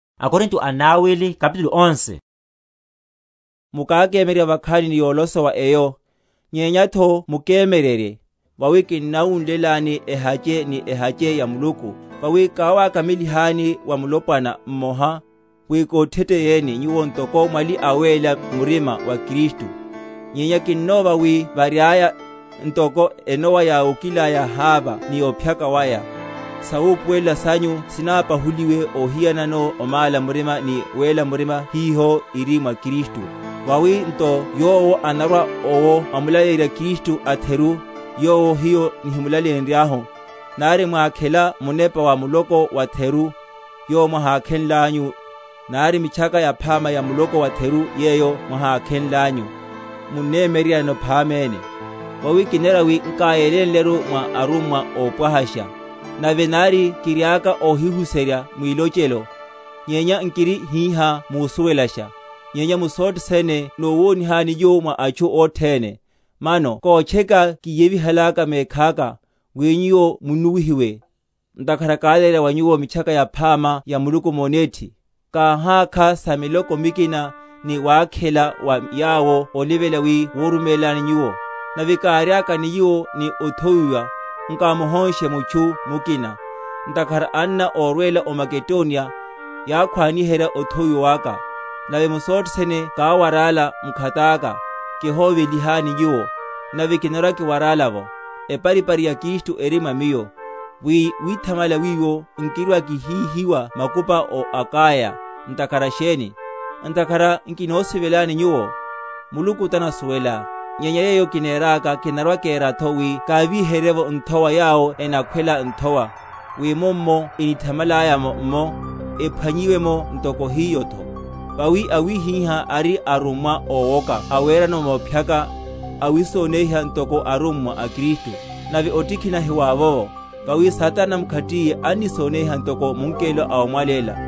Sa arummwa ówoka. Mukákemyeryerya vakhani ni yolosowa eyo! Nyenyatho mukemyeryerye. Vawi kinnawunlelani ehache ni ehache ya Muluku; vawi káwákamelihani wa mulopwana mmoha, wi kotheteyeni nyuwo ntoko mwali awéla murima wa Kristu. Nyenya kinnova, wi variaya, ntoko enowa yáwokilaya Hava ni ophyaka waya, sawupuwelela sanyu sinapahuliwa ohiyanano omála murima ni wéla murima hiho iri mwa Kristu. Vawi nto yowo anorwa owo amulaleyerya Kristu atheru, yowo hiyo nihimulaleyenryahu, nari mwakhela munepa wa muloko watheru, yowo mwahákhenlanyu, nari Mitchaka Yaphama ya muloko watheru yeyo mwahákhenlanyu, munnemyeryeryanano phaméne. Vawi kinera wi nkáyelénleru mwa arummwa ópwahasha. Nave nari kiriaka óhihuserya mwilochelo, nyenya nkiri hihá musuwelasha, nyenya mu sothe sene nowonihani nyuwo mwa atchu othene. Mano kotcheka kíyevihalaka mekhaka, wi nyuwo munnuwihiwe, ntakhara kálaleyerya wa nyuwo Mitchaka Yaphama ya Muluku monethi? Káhákha sa miloko mikina, ni wakhela wa yawo olivela wi koruméleni nyuwo; nave káriaka ni nyuwo, ni othowiwa, nkámuhónshe mutchu mukina; ntakhara anna órwela o Makedoniya, yákhwaniherya othowiwa waka; nave mu sothe sene káwarála mkhataka, kihoveliheni nyuwo, nave kinarwa kiwarála’vo. Eparipari ya Kristu eri mwa miyo, wi withamala wiwo nkirwa‐kihíhiwa makupa ó Akaya. Ntakhara sheni? Ntakhara nkinosivelani nyuwo? Muluku tanasuwela. Nyenya yeyo kineraka, kinarwa‐keratho wi kávíherye’vo nthowa yawo enakhwela nthowa; wi mummo enithamalaya’mo’mmo, ephwan?-?yiwe’mo ntoko hiyotho. Vawi awihiha ari arummwa ówoka awerano mophyaka, awisoneiha ntoko arummwa a Kristu. Nave otikhina hiwavovo; vawi Satana mkhatiye annisoneiha ntoko mungelo ómwaléla.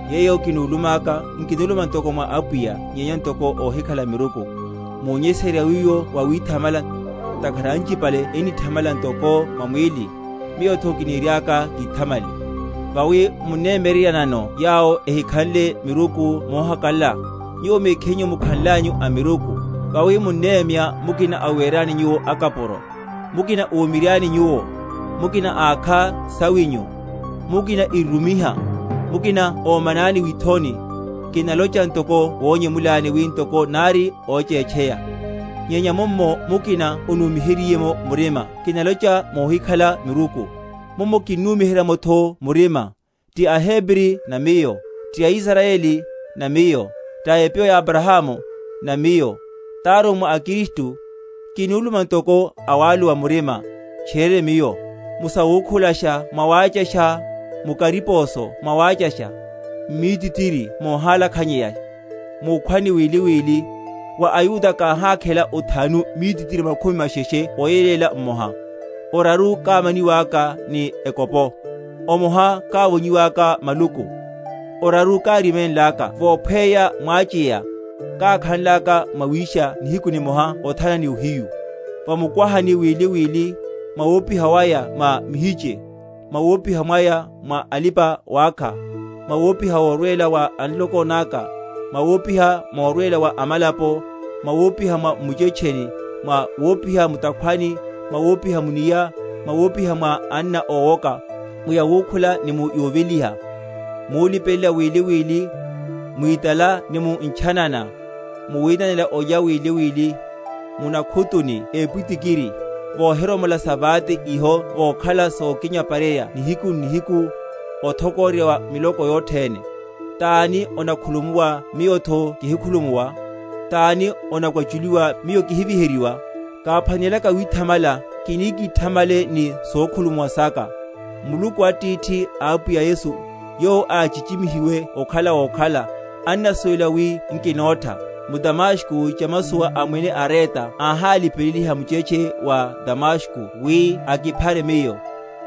Yeyo kinulumaka nkinuluma ntoko mwa Apwiya, nyenya ntoko óhikhala miruku, munyesererya wiwo wawithamala. Ntakhara anchipale ennithamala ntoko mwa mwíli, miyotho kiniriaka kithamale. Vawi munnemyeryeryanano yawo ehikhanle miruku mohakalala, nyuwo mekhinyu mukhanlanyu amiruku. Vawi munnemya mukina awerani nyuwo akapuro, mukina omiryani nyuwo, mukina ákha sawinyu, mukina irumiha, mukina omanani withoni. Kinalocha ntoko monyemula wi ntoko nári óchétcheya. Nyenya mummo mukina onumiheryiye’mo murima (kinalocha nuhikhala miruku) mummo kinnumiherya’motho murima. Ti aHebri? na miyo. Ti aIsrayeli? na miyo. Ta epyo ya Abrahamu? na miyo. Tarummwa a Kristu? (kinuluma ntoko awaluwa murima), tchiriene miyo; mu sawukhulasha mwawáchasha, mu kariposo mwawáchasha, m’mítitiri mohálakhanyeya, múkhwani wili wili. Wa aYuda káhákhela othanu mítitiri makhumi masheshe oyeléla mmoha. Oraru kámaniwaka ni ekopo, omoha kávonyiwaka maluku, oraru káriménlaka vophweya mwacheya, kákhanlaka mwawisha nihiku nimoha othana ni ohiyu; va mukwahani wili wili, mwa wopiha mwaya mwa mihiche, mwa wopiha mwaya mwa alipa‐wákha, mwa wopiha morwela wa a nloko naka, mwa wopiha morwela wa amalapo, mwa wopiha m’muchetcheni, mwa wopiha mu’takhwani, mwa wopiha mu’nia, mwa wopiha mwa anna ówoka; mu yawukhula ni mu yoveliha, mulipelela wili wili, mwitala ni mu ntchanana, mu winanela olya wili wili, mu nakhutu ni epwitikiri. Vohiromola sa vate iho vokhala yokinyaparerya nihiku n’nihiku, othokororya wa miloko yothene. Tani onakhulumuwa miyotho kihikhulumuwa? Tani onakwachulihiwa, miyo kihiviheryiwa? Káphwanelaka withamala, kini kíthamalele ni sokhulumuwa saka. Muluku Atithi a Apwiya Yesu, yowo áchichimihiwe okhala wokhala, annasuwela wi nkinótha. M’Damasko chamasowa a Mwene Areta áhalipeleliha muchetche wa Damasko wi akiphare miyo;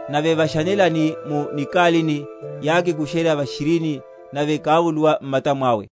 nave va janelani, mu nikalini, yákikurusha va’shirini, nave kávuluwa m’mata mwawe.